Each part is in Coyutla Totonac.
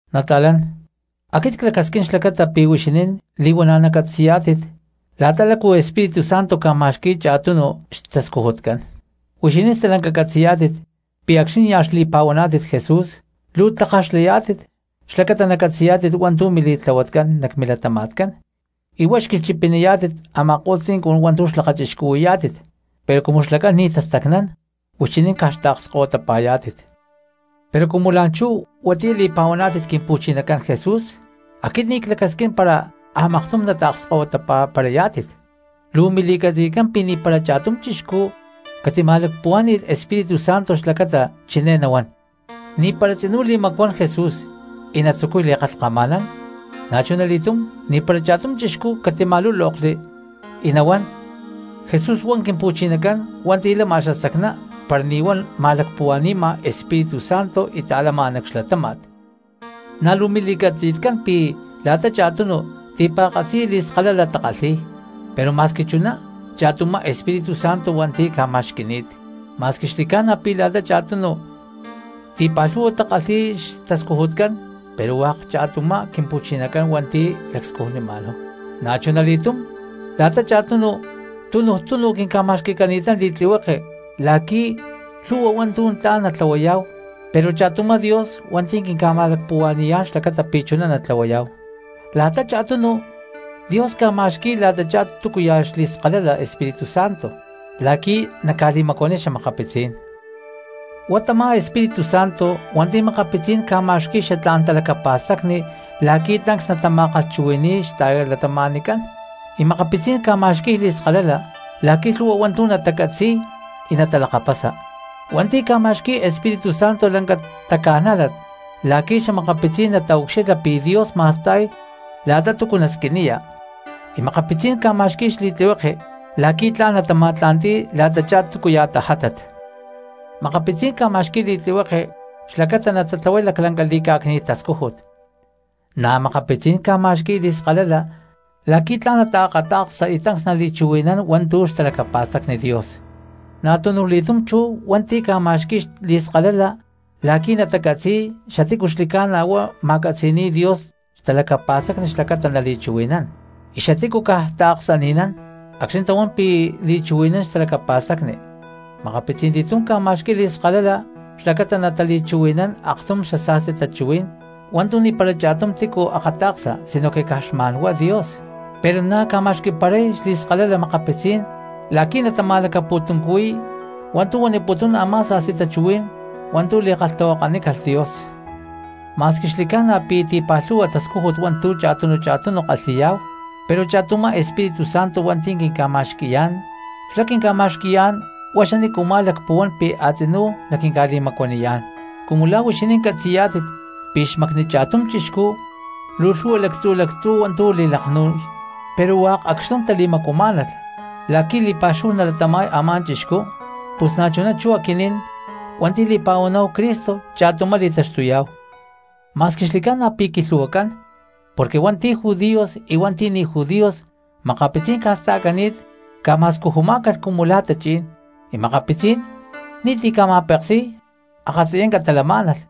Nata̠lán, aquit clacasquín xlacata pi̠ huixinín li̠huana̠ nacatzi̠yá̠tit la̠ta lácu Espíritu Santo ca̠ma̠xqui̠y cha̠tunu cristianos xtascujutcán. Huixinín stalanca catzi̠yá̠tit pi̠ acxni̠ nia̠ xli̠pa̠huaná̠tit Jesús luu tlakaj xlayá̠tit xlacata nacatzi̠yá̠tit hua̠ntu̠ mili̠tlahuatcán nac milatama̠tcán y huá xquilhchipiniyá̠tit a̠ma̠ko̠lh tzincun hua̠ntu̠ xca̠lakachixcuhui̠yá̠tit, pero cumu xlacán ni̠ tastacnán huixinín caj xtaakskahuitapa̠yá̠tit. Pero cumu la̠nchú huatiyá li̠pa̠huaná̠tit Quimpu̠chinacán Jesús aquit ni̠ clacasquín para a̠maktum nataakskahuiparayá̠tit. Lu̠ mili̠catzi̠tcán pi̠ ni̠para cha̠tum chixcú catima̠lacpuhuá̠ni̠lh Espíritu Santo xlacata chiné nahuán: “Ni̠para tzinú li̠macuán Jesús”, y natzucuy li̠kalhkama̠nán. Na̠chunali̠túm ni̠para cha̠tum chixcú catima̠lúlokli y nahuán: “Jesús huá Quimpu̠chinacán hua̠nti̠ lama xastacná”, para ni̠ huá ma̠lacpuhua̠ni̠ma Espíritu Santo y ta̠lama nac xlatáma̠t. Na̠ luu mili̠catzi̠tcán pi̠ la̠ta cha̠tunu cristianos ti̠pa̠katzi li̠skalala takalhi̠y, pero ma̠squi chuná cha̠tumá Espíritu Santo hua̠nti̠ ca̠ma̠xqui̠ni̠t. Ma̠squi xli̠ca̠na pi̠ la̠ta cha̠tunu cristianos ti̠pa̠lhu̠hua takalhi̠y xtascujutcán pero hua̠k cha̠tumá Quimpu̠chinacán hua̠nti̠ lacscujnima̠náhu. Na̠chunali̠túm la̠ta cha̠tunu cristianos tunuj túnu quinca̠ma̠xqui̠cani̠tán li̠tlihueke la̠qui̠ lhu̠hua hua̠ntu̠ tla̠n natlahuayá̠hu, pero cha̠tumá Dios hua̠nti̠ quinca̠ma̠lacpuhua̠ni̠yá̠n xlacata pi̠ chuná natlahuayá̠hu. La̠ta cha̠tunu cristianos, Dios ca̠ma̠xqui̠y la̠tachá túcuya̠ xli̠skalala Espíritu Santo la̠qui̠ naca̠li̠macuaniy xa̠makapitzí̠n cristianos. Huá tamá Espíritu Santo hua̠nti̠ makapitzí̠n cristianos ca̠ma̠xqui̠y xatlá̠n talacapa̠stacni la̠qui̠ tancs natama̠kalhchuhui̠ni̠y xta̠cristianoscán, y makapitzí̠n ca̠ma̠xqui̠y li̠skalala la̠qui̠ lhu̠hua hua̠ntu̠ natacatzi̠y y natalakapasa. Hui̠ntí ca̠ma̠xqui̠y Espíritu Santo lanca taca̠nájlat la̠qui̠ xa̠makapitzí̠n nataucxilha pi̠ Dios ma̠sta̠y la̠ta túcu nasquiniya, y makapitzí̠n ca̠ma̠xqui̠y xli̠tlihueke la̠qui̠ tla̠n natama̠tla̠nti̠y la̠tachá túcuya̠ tajátat. Makapitzí̠n ca̠ma̠xqui̠y li̠tlihueke xlacata natatlahuay laclanca li̠cá̠cni̠t tascújut, na̠ makapitzí̠n ca̠ma̠xqui̠y li̠skalala la̠qui̠ tla̠n nataakata̠ksa y tancs nali̠chuhui̠nán hua̠ntu̠ xtalacapa̠stacni Dios, na̠tunuj li̠túm chú hua̠nti̠ ca̠ma̠xqui̠y li̠skalala la̠qui̠ natacatzi̠y xatícu xli̠ca̠na huá ma̠catzi̠ni̠y Dios xtalacapa̠stacni xlacata nali̠chuhui̠nán, y xatícu caj taaksani̠nán acxni̠ tahuán pi̠ li̠chuhui̠nán xtalacapa̠stacni, makapitzí̠n li̠túm ca̠ma̠xqui̠y li̠skalala xlacata natali̠chuhui̠nán aktum sa̠sti tachuhuí̠n hua̠ntu̠ ni̠para cha̠tum tícu akata̠ksa sinoque caj xma̠n huá Dios, pero na̠ ca̠ma̠xqui̠paray li̠skalala makapitzí̠n la̠qui̠ natama̠lacapu̠tuncuhui̠y hua̠ntu̠ huaniputún a̠má sa̠sti tachuhuí̠n hua̠ntu̠ li̠kalhtahuakanícalh Dios. Ma̠squi xli̠ca̠na pi̠ ti̠pa̠lhu̠hua tascújut hua̠ntu̠ cha̠tunu cha̠tunu kalhi̠yá̠hu pero cha̠tumá Espíritu Santo hua̠nti̠ quinca̠ma̠xqui̠yá̠n, xlá quinca̠ma̠xqui̠yá̠n huá xanícuma̠ lacpuhuán pi̠ a̠tzinú naquinca̠li̠macuaniyá̠n. Cumu la̠ huixinín catzi̠yá̠tit pi̠ xmacni cha̠tum chixcú luu lhu̠hua lactzu̠ lactzú hua̠ntu̠ li̠laknu̠y pero hua̠k acxtum tali̠macuamá̠nalh la̠qui̠ li̠pa̠xúhu nalatama̠y a̠má chixcú, pus na̠chuná chú aquinín hua̠nti̠ li̠pa̠huaná̠hu Cristo cha̠tumá li̠taxtuyá̠hu. Ma̠squi xli̠ca̠na pi̠ qui̠lhu̠huacán porque hui̠ntí judíos y hui̠ntí ni̠ judíos, makapitzí̠n ca̠sta̠cani̠t ca̠ma̠scujumá̠calh cumu la̠ tachí̠n, y makapitzí̠n ni̠ti̠ ca̠ma̠peksi̠y akatziyanca talamá̠nalh,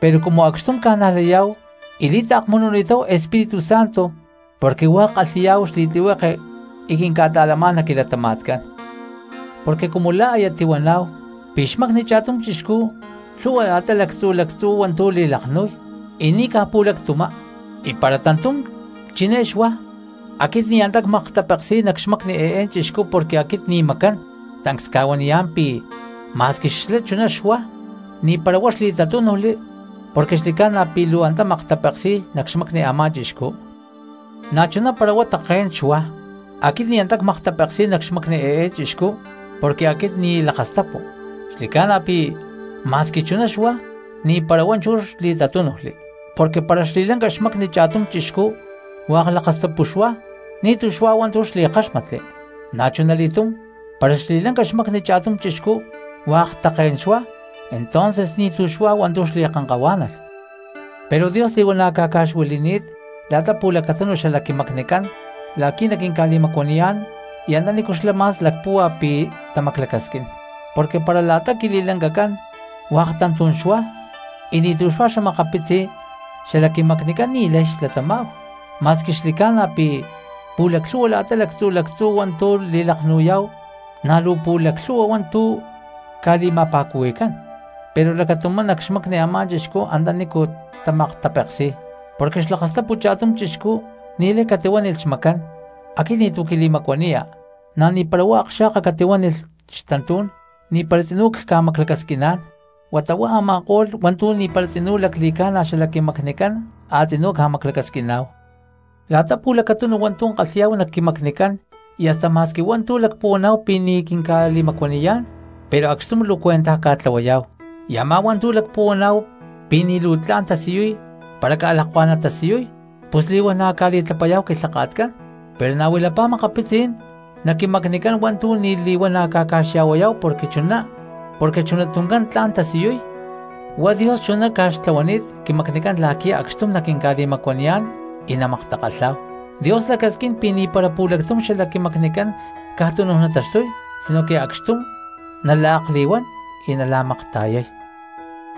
pero cumu acxtum ca̠najlayá̠hu y li̠taakmununi̠táhu Espíritu Santo porque hua̠k kalhi̠yá̠hu xli̠tlihueke y quinca̠ta̠lamá̠n nac quilatama̠tcán. Porque cumu la̠ aya tihuaná̠hu pi̠ xmacni cha̠tum chixcú lhu̠hua la̠ta lactzu̠ lactzú hua̠ntu̠ li̠laknu̠y, y ni̠caj pu̠lactumá, y para tantú̠n chiné xuá: “Aquit ni̠ antá cmaktapeksi̠y nac xmacni eé chixcú porque aquit ni̠ macán”, tancs cca̠huaniyá̠n pi̠ ma̠squi xlá chuná xuá ni̠para huá xli̠tatúnujli porque xli̠ca̠na pi̠ luu antá maktapeksi̠y nac xmacni a̠má chixcú. Na̠chuná para huá také̠n xuá: “Aquit ni̠ antá cmaktapeksi̠y nac xmacni eé chixcú porque aquit ni̠ lakastapu”, xli̠ca̠na pi̠ ma̠squi chuná xuá ni̠para huá chú xli̠tatúnujli. Porque para xli̠lanca xmacni cha̠tum chixcú hua̠k lakastapu xuá, ni̠tu̠ xuá hua̠ntu̠ xli̠káxmatli. Na̠chunali̠túm para xli̠lanca xmacni cha̠tum chixcú hua̠k také̠n xuá, entonces ni̠tu̠ xuá hua̠ntu̠ xli̠kankahuá̠nalh. Pero Dios li̠huana̠ ca̠ca̠xuili̠ni̠t la̠ta pu̠lacatunu xala quimacnicán la̠qui̠ naquinca̠li̠macuaniyá̠n y antanícu xlá ma̠s lacpúhua pi̠ tamaclacasquín. Porque para la̠ta quili̠lancacán hua̠k tantú̠n xuá y ni̠tu̠ xuá xa̠makapitzi xalac quimacnicán ni̠lay xlatamá̠hu. Ma̠squi xli̠ca̠na pi̠ pu̠laclhu̠hua la̠ta lactzu̠ lactzú hua̠ntu̠ li̠laknu̠yá̠hu na̠ luu pu̠laclhu̠hua hua̠ntu̠ ca̠li̠ma̠pa̠cuhui̠cán, pero lacatumá nac xmacni a̠má chixcú antanícu tamaktapeksi̠y. Porque xlakastapu cha̠tum chixcú ni̠lay catihuánilh xmacán: “Aquit ni̠tu̠ quili̠macuaniya”; na̠ ni̠para huá akxa̠ka catihuánilh xtantú̠n: “Ni̠para tzinú cca̠maclacasquiná̠n.” Huata huá a̠ma̠ko̠lh hua̠ntu̠ ni̠para tzinú lacli̠ca̠na xalac quimacnicán a̠tzinú ca̠maclacasquiná̠hu. La̠ta pu̠lacatunu hua̠ntu̠ kalhi̠yá̠hu nac quimacnicán y hasta ma̠squi hua̠ntu̠ lacpuhuaná̠hu pi̠ ni̠tu̠ quinca̠li̠macuaniyá̠n, pero acxtum luu cuentaj ca̠tlahuayá̠hu; y a̠má hua̠ntu̠ lacpuhuaná̠hu pi̠ ni̠ luu tla̠n tasiyuy para ca̠lakuá̠n natasiyuy, pus li̠huana̠ ca̠li̠tlapayá̠hu quilhaka̠tcán. Pero na̠ huilapá makapitzí̠n nac quimacnicán hua̠ntu̠ ni̠ li̠huana̠ ca̠ca̠xya̠huayá̠hu porque chuná tuncán tla̠n tasiyuy. Huá Dios chuná ca̠xtlahuani̠t quimacnicán la̠qui̠ acxtum naquinca̠li̠macuaniyá̠n y namaktakalhá̠hu. Dios lacasquín pi̠ ni̠para pu̠lactum xalac quimacnicán caj tunu nataxtuy sinoque acxtum nala̠akli̠huán y nala̠makta̠yay.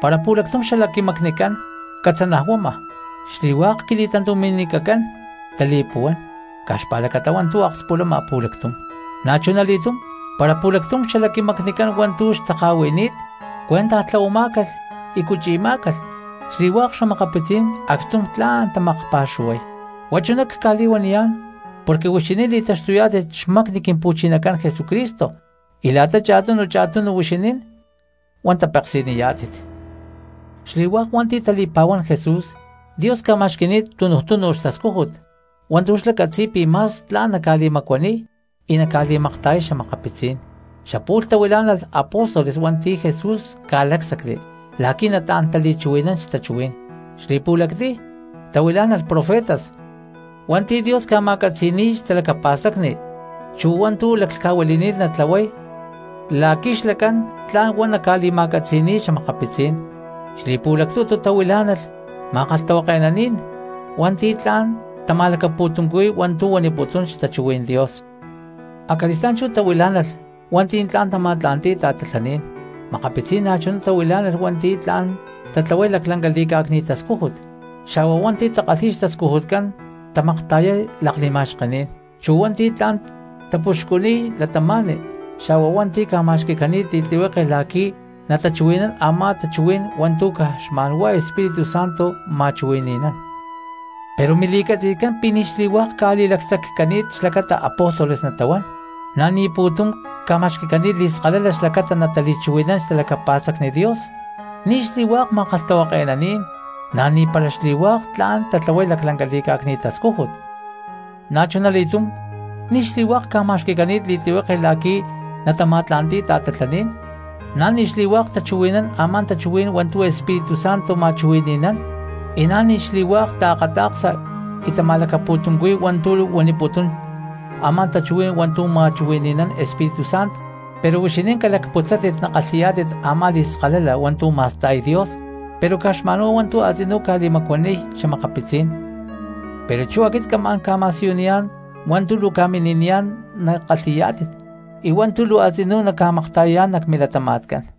Para pu̠lactum xalac quimacnicán catzanajuama, xli̠hua̠k quili̠tantumi̠nicacán tali̠puhuán caj xpa̠lacata hua̠ntu̠ akspulama pu̠lactum. Na̠chunali̠túm para pu̠lactum xalac quimacnicán hua̠ntu̠ xtaka̠hui̠ni̠t cuentaj tlahuamá̠calh y cuchi̠má̠calh, xli̠hua̠k xa̠makapitzí̠n acxtum tla̠n tamakpa̠xuhuay. Huá chuná cca̠li̠huaniyá̠n porque huixinín li̠taxtuyá̠tit xmacni Quimpu̠chinacán Jesucristo, y la̠ta cha̠tunu cha̠tunu huixinín huá tapeksi̠niyá̠tit. Xli̠hua̠k hua̠nti̠ tali̠pa̠huán Jesús, Dios ca̠ma̠xqui̠ni̠t tunuj tunu xtascújut hua̠ntu̠ xlá catzi̠y pi̠ ma̠s tla̠n naca̠li̠macuaniy y naca̠li̠makta̠yay xa̠makapitzí̠n. Xapu̠lh tahuilá̠nalh apóstoles hua̠nti̠ Jesús ca̠lácsacli la̠qui̠ nataán tali̠chuhui̠nán xtachuhuí̠n; xli̠pu̠lactiy tahuilá̠nalh profetas hua̠nti̠ Dios ca̠ma̠catzi̠ni̠y xtalacapa̠stacni chu hua̠ntu̠ laclhca̠huili̠ni̠t natlahuay la̠qui̠ xlacán tla̠n huá naca̠li̠ma̠catzi̠ni̠y xa̠makapitzí̠n; xli̠pu̠lactutu tahuilá̠nalh ma̠kalhtahuake̠naní̠n hua̠nti̠ tla̠n tama̠lacapu̠tuncuhui̠y hua̠ntu̠ huaniputún xtachuhuí̠n Dios; acali̠stá̠n chú tahuilá̠nalh hua̠nti̠ tla̠n tama̠tla̠nti̠y ta̠tatlaní̠n; makapitzí̠n na̠chuná tahuilá̠nalh hua̠nti̠ tla̠n tatlahuay laclanca li̠cá̠cni̠t tascújut; xa̠huá hua̠nti̠ takalhi̠y xtascujutcán tamakta̠yay li̠ma̠xkení̠n; chu hua̠nti̠ tla̠n tapuxcuniy cristianos; xa̠huá hua̠nti̠ ca̠ma̠xqui̠cani̠t li̠tlihueke la̠qui̠ natachuhui̠nán a̠má tachuhuí̠n hua̠ntu̠ caj xma̠n huá Espíritu Santo ma̠chuhui̠ni̠nán. Pero mili̠catzi̠tcán pi̠ ni̠ xli̠hua̠k ca̠li̠lacsaccani̠t xlacata apóstoles natahuán, na̠ ni̠ pu̠tum ca̠ma̠xqui̠cani̠t li̠skalala xlacata natali̠chuhui̠nán xtalacapa̠stacni Dios, ni̠ xli̠hua̠k ma̠kalhtahuake̠naní̠n, na̠ ni̠para xli̠hua̠k tla̠n tatlahuay laclanca li̠cá̠cni̠t tascújut. Na̠chunali̠túm ni̠ xli̠hua̠k ca̠ma̠xqui̠cani̠t li̠tlihueke la̠qui̠ natama̠tla̠nti̠y ta̠tatlaní̠n, na̠ ni̠ xli̠hua̠k tachuhui̠nán a̠má tachuhuí̠n hua̠ntu̠ Espíritu Santo ma̠chuhui̠ni̠nán, y na̠ ni̠ xli̠hua̠k taakata̠ksa y tama̠lacapu̠tuncuhui̠y hua̠ntu̠ huaniputún a̠má tachuhuí̠n hua̠ntu̠ ma̠chuhui̠ni̠nán Espíritu Santo. Pero huixinín calacputzátit nakalhi̠yá̠tit a̠má li̠skalala hua̠ntu̠ ma̠sta̠y Dios pero caj xma̠nhuá hua̠ntu̠ a̠tzinú ca̠li̠macuaniy xa̠makapitzí̠n. Pero chú aquit camá̠n ca̠ma̠siyuniyá̠n hua̠ntu̠ luu ca̠mini̠niyá̠n nakalhi̠yá̠tit y hua̠ntu̠ luu a̠tzinú naca̠makta̠yayá̠n nac milatama̠tcán.